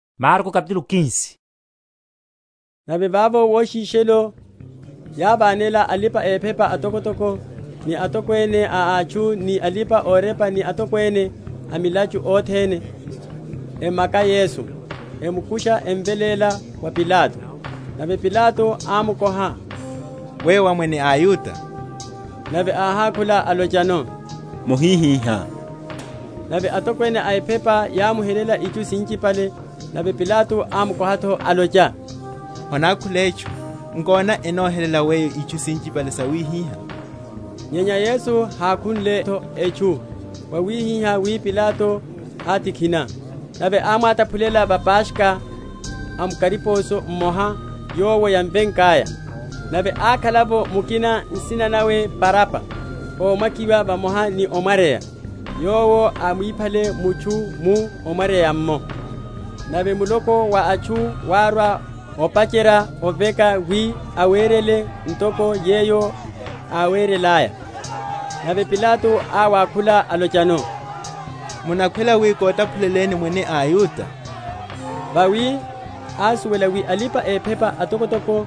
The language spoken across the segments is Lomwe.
Yesu ni Pilato. Nave vavo woshishelo yávanela alipa‐ephepa atokotoko ni atokwene a atchu, ni alipa‐orepa, ni atokwene a milachu othene, emaka Yesu, emukusha, emveléla wa Pilato. Nave Pilato ámukoha, Weyo wá Mwene a aYuda? Nave áhákhula, alochano, Mohihihá. Nave atokwene a ephepa yámuhelela itchu sinchipale. Nave Pilato ámukoha’tho, alocha, Honákhule etchu? Nkona, enohelela Weyo itchu sinchipale sawihiha? Nyenya Yesu hákhunle’tho etchu; wawihihá wi Pilato átikhina. Nave ámwataphulela va Paskha, a mu kariposo mmoha, yowo yámvekaya. Nave ákhala’vo mukina, nsina nawe Baraba, ómakiwa vamoha ni ómwaryeya, yowo ámwiphale mutchu mu omwaryeya’mmo. Nave muloko wa atchu wárwa, opacherya oveka wi awerele ntoko yeyo áwerelaya. Nave Pilato áwakhula, alochano, Munakhwela wi kotaphuleleni Mwene a aYuda? Vawi ásuwela wi alipa‐ephepa atokotoko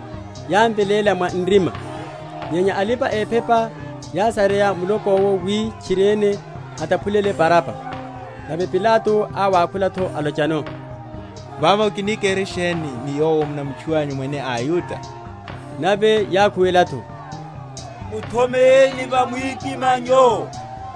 yámveléla mwa nrima. Nyenya alipa‐ephepa yásaserya muloko’wo wi tchiriene átaphulele Baraba. Nave Pilato áwakhula’tho, alochano, Vavo kini kere sheni ni Yowo munamutchuwanyu Mwene a aYuda? Nave yákhuwela’tho, Muthomeyeni va mwikimanyo.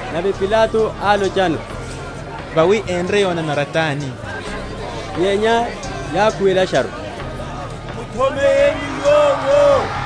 Nave Pilato álochano, Vawi enre yonanara tani? Nyenya yákhuwelasharu, Muthomeyeni Yowo.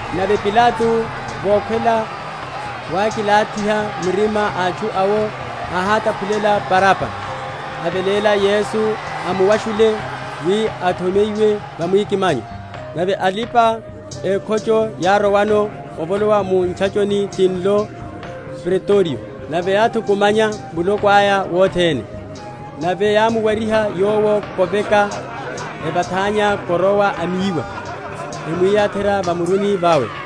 Nave Pilato vokhwela wákilathiha mirima atchu awo, áhátaphulela Baraba, aveléla Yesu, amuwashunle, wi athomeyiwe va mwikimanyo. Nave alipa‐ekhocho yárowano evolowa mu ntchachoni tinlo Pretorio; nave yáthukumanya muloko aya wothene. Nave yámuwariha Yowo koveka, evathanya korowa a miwa emwiyatherya va muruni vawe.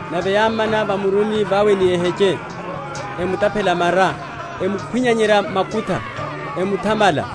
nave yámmana va muruni vawe ni eheche, emutaphela mara, emukhwinyanyerya makutha, emuthamala.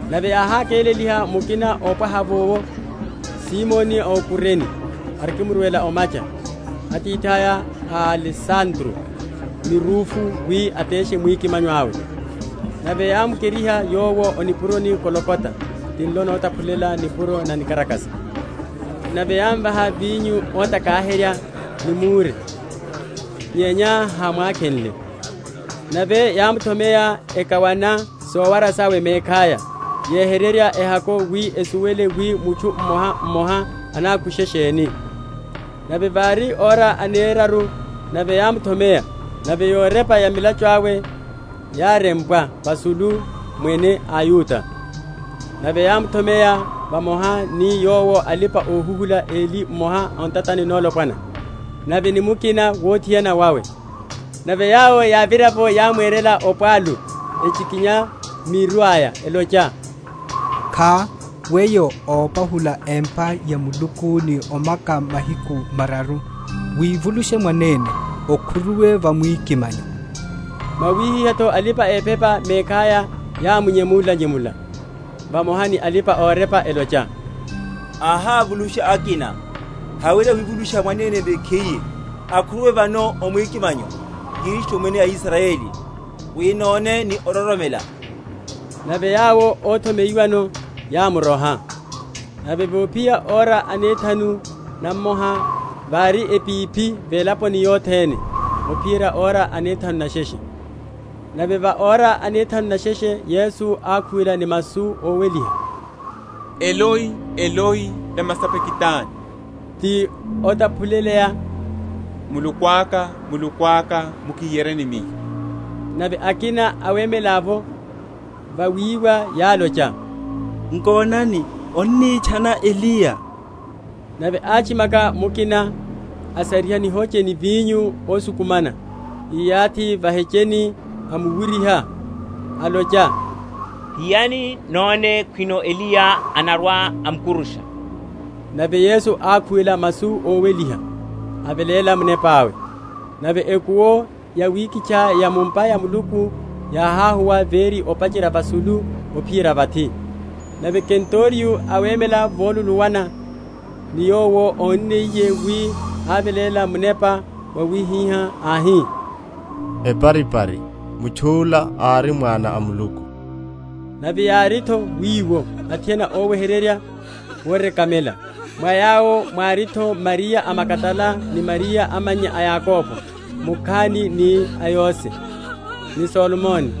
Nave yáhakéleliha mukina ópwaha’vo, Simoni a o Kurene, arikimurwela o’macha, atithaya a Alesandro ni Rufu, wi ateshe mwikimanyo awe. Nave yámukeriha Yowo o nipuroni Golgota, tinlo notaphuleya, Nipuro na nikarakasa. Nave yámvaha vinyo ótakaherya ni mure: nyenya hámwakhenle. Nave yámuthomeya, ekawana sowara sawe mekhaya, yehererya ehako, wi esuwele wi mutchu mmoha mmoha anakushe sheni. Nave vári ora aneraru nave yámuthomeya. Nave yorepa ya mulachu awe yárempwa vasulu, MWENE A AYUDA. Nave yámuthomeya vamoha ni Yowo alipa‐ohuhula eli; mmoha o ntatani nolopwana nawe ni mukina wuthiana wawe. Nave yawo yávira’vo, yámwerela opwalu, echikinya miru aya, elocha, Kha! weyo ópahula empa ya Muluku ni omaka mahiku mararu, wivulushe mwanene, okhuruwe va mwikimanyo. Mwawihihá’tho alipa‐ephepa mekhaya yámunyemula‐nyemula vamoha ni alipa‐orepa, elocha, Áhávulusha akina; hawerya wivulusha mwanene mekhiye. Akhuruwe vano o mwikimanyo, Kristu Mwene a Israyeli, wi none ni ororomela. Nave yawo óthomeyiwano yámuroha. Nave vophiya ora anethanu namoha vári epiphi velaponi yothene, ophiyerya ora anethanu nesheshe. Nave va ora anethanu nesheshe, Yesu ákhuwela ni masu óweliha, Eloi, Eloi, lama sabakitani? ti otaphuleya, Muluku aka, Muluku aka, mukihiyeryeni Miyo? Nave akina awemela’vo vawiwa yálocha, Nkonani, annitchana Eliya. Nave átchimaka mukina, asariha nihoche ni vinyo ósukumana, íyathi va’hecheni, amuwuryiha, alocha, Hiyani; none khwino Eliya anarwa omukurusha. Nave Yesu ákhuwela masu óweliha, aveléla munepa awe. Nave ekuwo yawikitcha ya mu’mpa ya Muluku yáháhuwa véri, opacherya vasulu ophiyerya vathi. Nave kenturiyo, awemela voluluwana ni Yowo, ónniye wi aveléla munepa wawihihá, áhi, Eparipari, Mutchu’la ári Mwana a Muluku. Nave yári’tho wiwo athiana óweherya worekamela: mwa yawo mwári’tho Mariya a Magadala ni Mariya amannya a Yakobo mukhani, ni a Yose, ni Salome;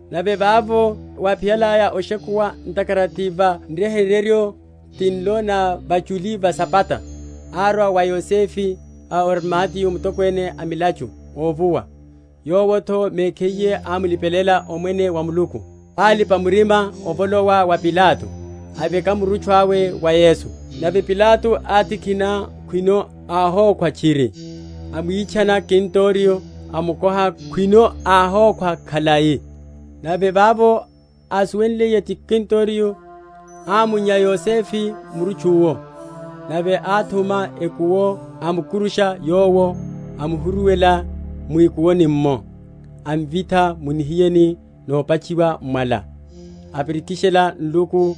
Nave vavo wáphiyalaya oshekuwa, ntakhara ti va Nryeheryo, tinlo na vachuli va Sabata, árwa’vo Yosefe a o Arimateya, mutokwene a milachu óvuwa, yowo’tho mekhiye ámulipelela Omwene wa Muluku; alipa‐murima, avolowa wa Pilato, aveka murutchu awe wa Yesu. Nave Pilato átikhina, khwino áhokhwa tchiri; amwitchana kenturiyo, amukoha khwino áhokhwa khalai. Nave vavo ásuwenliye ti kenturiyo, ámunnya Yosefe murutchu’wo. Nave áthuma ekuwo, amukurusha Yowo, amuhuruwela mwikuwoni’mmo, amvitha mu nihiyeni nopatchiwa m’mwala; apirikishela nluku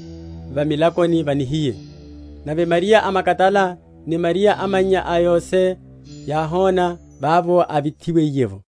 va milakoni va nihiye. Nave Mariya a Magadala ni Mariya amannya a Yose yáhona vavo ávithiwiye’vo.